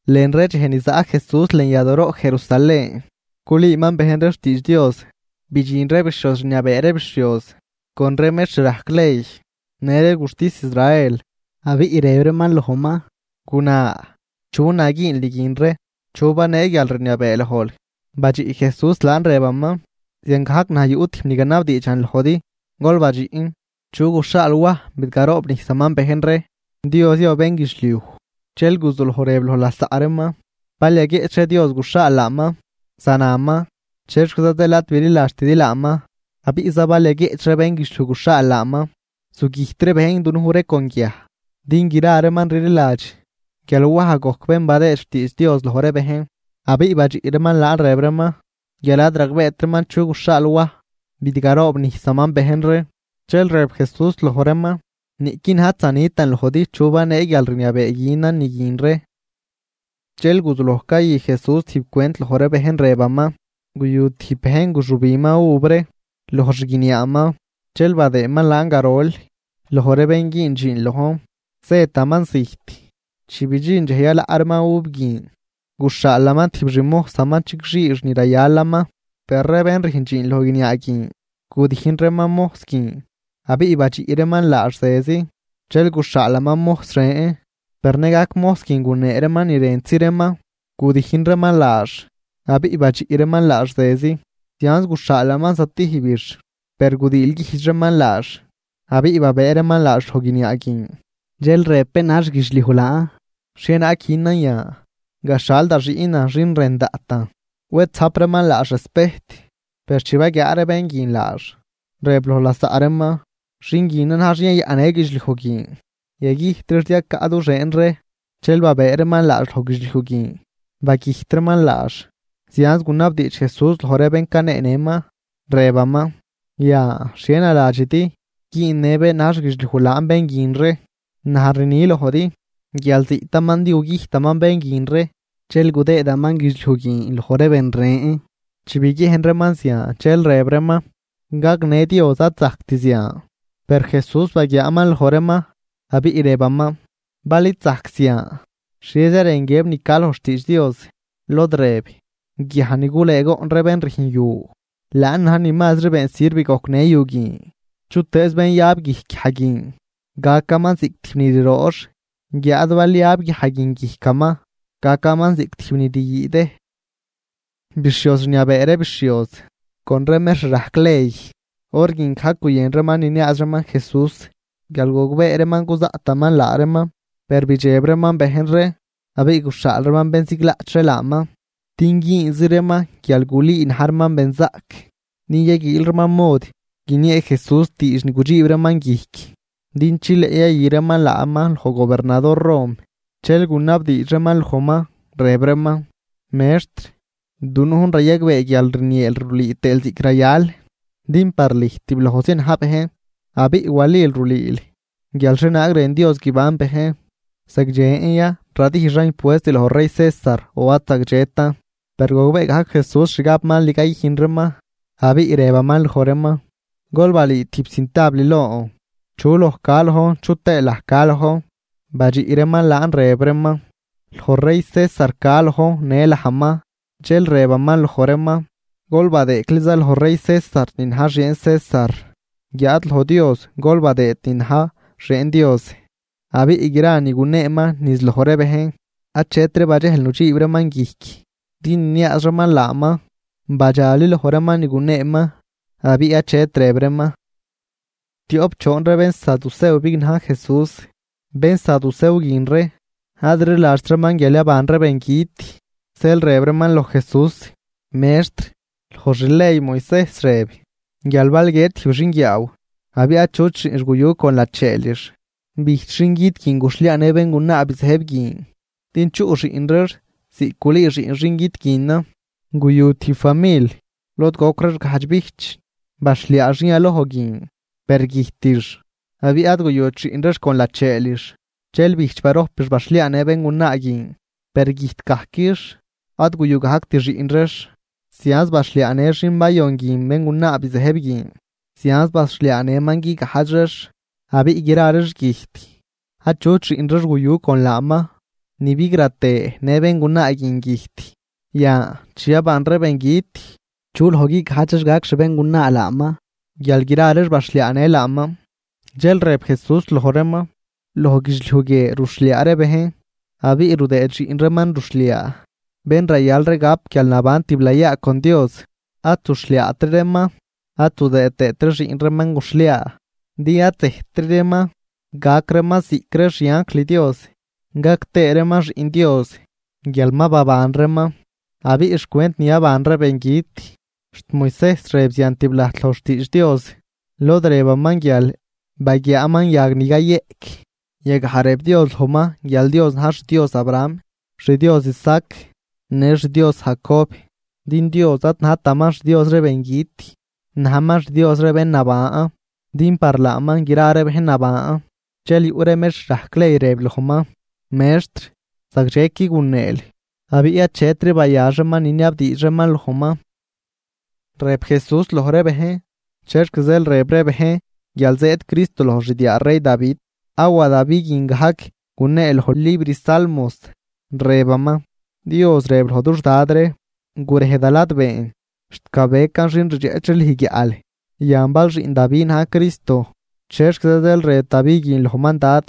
Lën ree dxej ni zaꞌ Jesús lën yadooroꞌ Jerusalén, culüüman bejn ree xtiidx Dios, bidxin ree bixhioz rniabee ree bixhioz, con ree mextr rajc ley, në ree guxtis Israel, abiꞌ rëb reeman lojman: ―Guna, ¿chu na güünl ni guin ree? ¿Chu banee guialrniabee lojl? Badxiꞌ Jesús laan, rëbaman: ―Ziangajc naj yuꞌ tijb ni ganabdiidxan lojdi. Gol badxiꞌn: ¿chu guxhaal Waj bidgaroobnijsaman bejn ree, Dios ya o bénguidxliuj? Dxel guzuloj rëb loj lasaꞌ reeman: ―Bal yaguieꞌch ree Dios guxhaal laaman, zanaman. “¿Chexquiza zeel ad bililadxtidi laaman?” Abiꞌza bal yaguieꞌch ree bénguidxliuj guxhaal laaman, zugüjt ree bejn dunuj ree con guiaj din gra reeman rliladx guial Waj gojc bén badëë xtiidx Dios loj ree bejn. Abiꞌ badxiꞌ reeman laan rëb reeman guial ad ragbeet reeman chu guxhaal Waj bidgaroobnijsaman bejn ree. Dxel rëb Jesús loj reeman: ―Niꞌqui naj ad zanitan lojdi chu banee guialrniabee günan ni guin ree. Dxel guzuloj cayü Jesús tijb cwent loj ree bejn, rëbaman: ―Guyu tijb bejn guxübinman uv ree loj xguiniaaman, dxel badëëman laan garol loj ree bén güün dxiin lojn, zëtaman zijt. Chi bidxin dxej yalaꞌ reeman uv guin, guxhaalaman tijb xmojsaman chigxiix ni rayalaman, per ree bén rüjn dxiin loj guiniaa guin gudijn reeman mojs guin abiꞌ badxiꞌ reeman laax zezi. Dxel guxhaalaman mojs ren, per nëgajc mojs guin gunee reeman ni rëntzi reeman, gudijn reeman laax abiꞌ badxiꞌ reeman laax zezi. Zianz guxhaalaman zatijbix, per gudiilguijdx reeman laax abiꞌ babëë reeman laax loj guiniaa guin. ’Dxel rëb bén na̱j xguidxliuj laan: “¿Xhienaag günan yan? Gaxhal da xiꞌnan xin rën daꞌtan, wed zajp reeman laax respejt.” Per chi baguiaa ree bén guin laax, rëb loj lasaꞌ reeman: “Xin guinan na̱j xin yayaꞌnnë guidxliuj guin. Yagüjt reex din gacan du xieen ree.” Dxel babëë reeman laax loj guidxliuj guin, bagüjt reeman laax. Zianz gunabdiidx Jesús loj ree bén caneenëman, rëbaman: ―Yan, ¿xhie naladxidi güünnë bén na̱j xguidxliuj laan bén guin ree? Naj rni lojdi guial ziꞌtaman din gugüjtaman bén guin ree dxel gudëëman guidxliuj guin loj ree ben ren. Chi biguiejn reeman zian dxel rëb reeman: ―¡Gagnë Dios ad zajct zian! Per Jesús baguiaaman loj reeman, abiꞌ rëbaman: ―Bal id zajc zian ¿xhieza rën guiëb ni ca loj xtiidx Dios? Lod rëb: Guiaj ni gulëëgoꞌn ree bén rüjn yu, laan na̱j ni mazri been sirv gojcnë yu guin. Chutëëz bén yab guijc guiaj guin, gacaman ziꞌc tijb ni riroox, guiáad bal yab guiaj guin guijcaman, gacaman ziꞌc tijb ni ryüüdëj. Bixhioz rniabee ree bixhioz con ree mextr rajc ley, hor guin gajc guyën reeman niniaaz reeman Jesús guial gogbee reeman cuzaꞌtaman laa reeman, per bidxeb reeman bejn ree. Abiꞌ guxhaal reeman bén ziglaꞌch ree laaman din güünzi reeman guial gulüü na̱j reeman benzaꞌc, din yaguiil reeman mod guiniee Jesús diidx ni gudxiib reeman guijc, din chileꞌ yayü reeman laaman loj gobernador Rom. Dxel gunabdiidx reeman lojman, rëb reeman: ―Mextr, dunujn rayagbee guial rnieel rulüü tëël ziꞌc rayal, din par lüj tiblojzi na̱j bejn, abiꞌ walil rulüül guial xhienaag rën Dios guiban bejn. ¿Zagdxen ya radijxan impuest loj rey César, o ad zagdxetan? Per gogbee gajc Jesús xgab mal ni cayüjn reeman abiꞌ rëbaman loj reeman: ―Gol balüü tijb cintabl lon. ¿Chu loj ca lojn chu tëë laj ca lojn? Badxiꞌ reeman laan, rëb reeman: ―Loj rey César ca lojn në lajman. Dxel rëbaman loj reeman: ―Gol badëëcliza loj rey César ni na̱j xieen César, guiáad loj Dios gol badëë ni na̱j xieen Dios. Abiꞌ gra ni guneeman niz loj ree bejn, achetri badxejl nudxiib reeman guijc din niniaaz reeman laaman. Badxali loj reeman ni guneeman abiꞌ achetri rëb reeman. Tioꞌp choon ree bénsaducew bignaj Jesús, bénsadusew guin ree ad rliladxt reeman guial yaban ree bengüt, zeel rëb reeman loj Jesús: ―Mextr, loj xley Moisejs rëb guial bal guiët tijb xinguiaaw abiꞌ achut xiꞌnx guyu con lacheelix, bijch xingüt guin guxhliaanë béngunaa bizëjb guin din chuꞌ xiꞌn reex ziꞌc gulüü xiꞌn xin güt guinan. Guyu tijb famil lod goc reex gajdx bijch. Baxhliaa xin yaloj guin, per güjtix abiꞌ ad guyut xiꞌn reex con lacheelix. Dxel bijch barojpix baxhliaanë béngunaa guin, per güjtgajquix ad guyu gajct xiꞌn reex. Zianz baxhliaanë xin bayon guin béngunaa bizëjb guin, zianz baxhliaanëman guigajdx reex abiꞌ gra reex güjt achut xiꞌn reex guyu con laaman. Ni bigratë në béngunaa guin güjt. Yan, chi yaban ree bengüt, ¿chu loj guigajdx reex gac xbéngunaa laaman guial gra reex baxhliaanë laaman? Dxel rëb Jesús loj reeman: ―Loj guidxliuj guie ruxhliaa ree bejn abiꞌ rudëëd xiꞌn reeman ruxhliaa. Per ree bén yaban zatijb, bén rayal ree gap guialnaban tiblayaa con Dios, ad zuxhliaatri reeman ad zudëë tëëtri xiꞌn reeman guxhliaa, din ad zëjttri reeman, gac reeman ziꞌc ree xianjl Dios. Gac tëë reeman xiꞌn Dios guial ma baban reeman. Abiꞌ xcwent ni yaban ree bengüt, xt Moisejs rëb zian tiblajt loj xtiidx Dios lod rëbaman guial baguiaaman yag ni cayeꞌc. Yagaj rëb Dios lojman guial Dios na̱j xDios Abraham, xDios Isaac, në xDios Jacob. Din Dios ad najtaman xDios ree bengüt, najman xDios ree bén naban, din par laaman gra ree bejn naban. Dxel yuꞌ ree mextr rajc ley, rëb lojman: ―Mextr, zagdxequi guneel. Abiꞌ achetri bayax reeman niniabdiidx reeman lojman. Rëb Jesús loj ree bejn: ―¿Chexc zeel rëb ree bejn guial zëëd Cristo loj xdiaa rey Davi? Awa Davi guin gajc gunee loj libr Salmos, rëbaman: Dios rëb loj dux Dad ree: “Gurej da ladbeen, xt gabecan xin rdxeꞌch ree lüj guiaꞌl.” Yan, bal xiꞌn Davi na̱j Cristo. ¿Chexquiza zeel rëb Davi guin lojman Dad?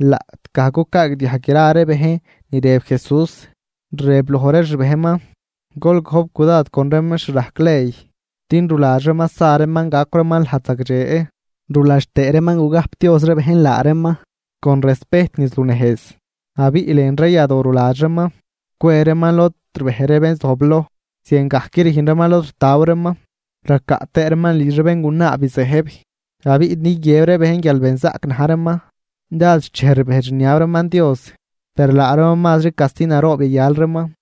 Laꞌtgaj cucaagdiajg gra ree bejn ni rëb Jesús, rëb loj ree xbejnman: ―Gol gojp cudad con ree mextr rajc ley. Din ruladx reeman sa reeman gacw reeman lajd zagdxe ruladx tëë reeman gugajpdioz ree bejn laa reeman con respejt niz lunejz, abiꞌ lën ree yadoo ruladx reeman cwe reeman lod rbej ree bén zojbloj, ziangajc rüjn reeman lod ritaw reeman. Racaꞌ tëë reeman lidx ree béngunaa bizëjb, abiꞌ din guiëb ree bejn guial benzaꞌc na̱j reeman, dád xchej rbejdx rniab reeman Dios. Per laa reeman mazri casti naroob yayal reeman.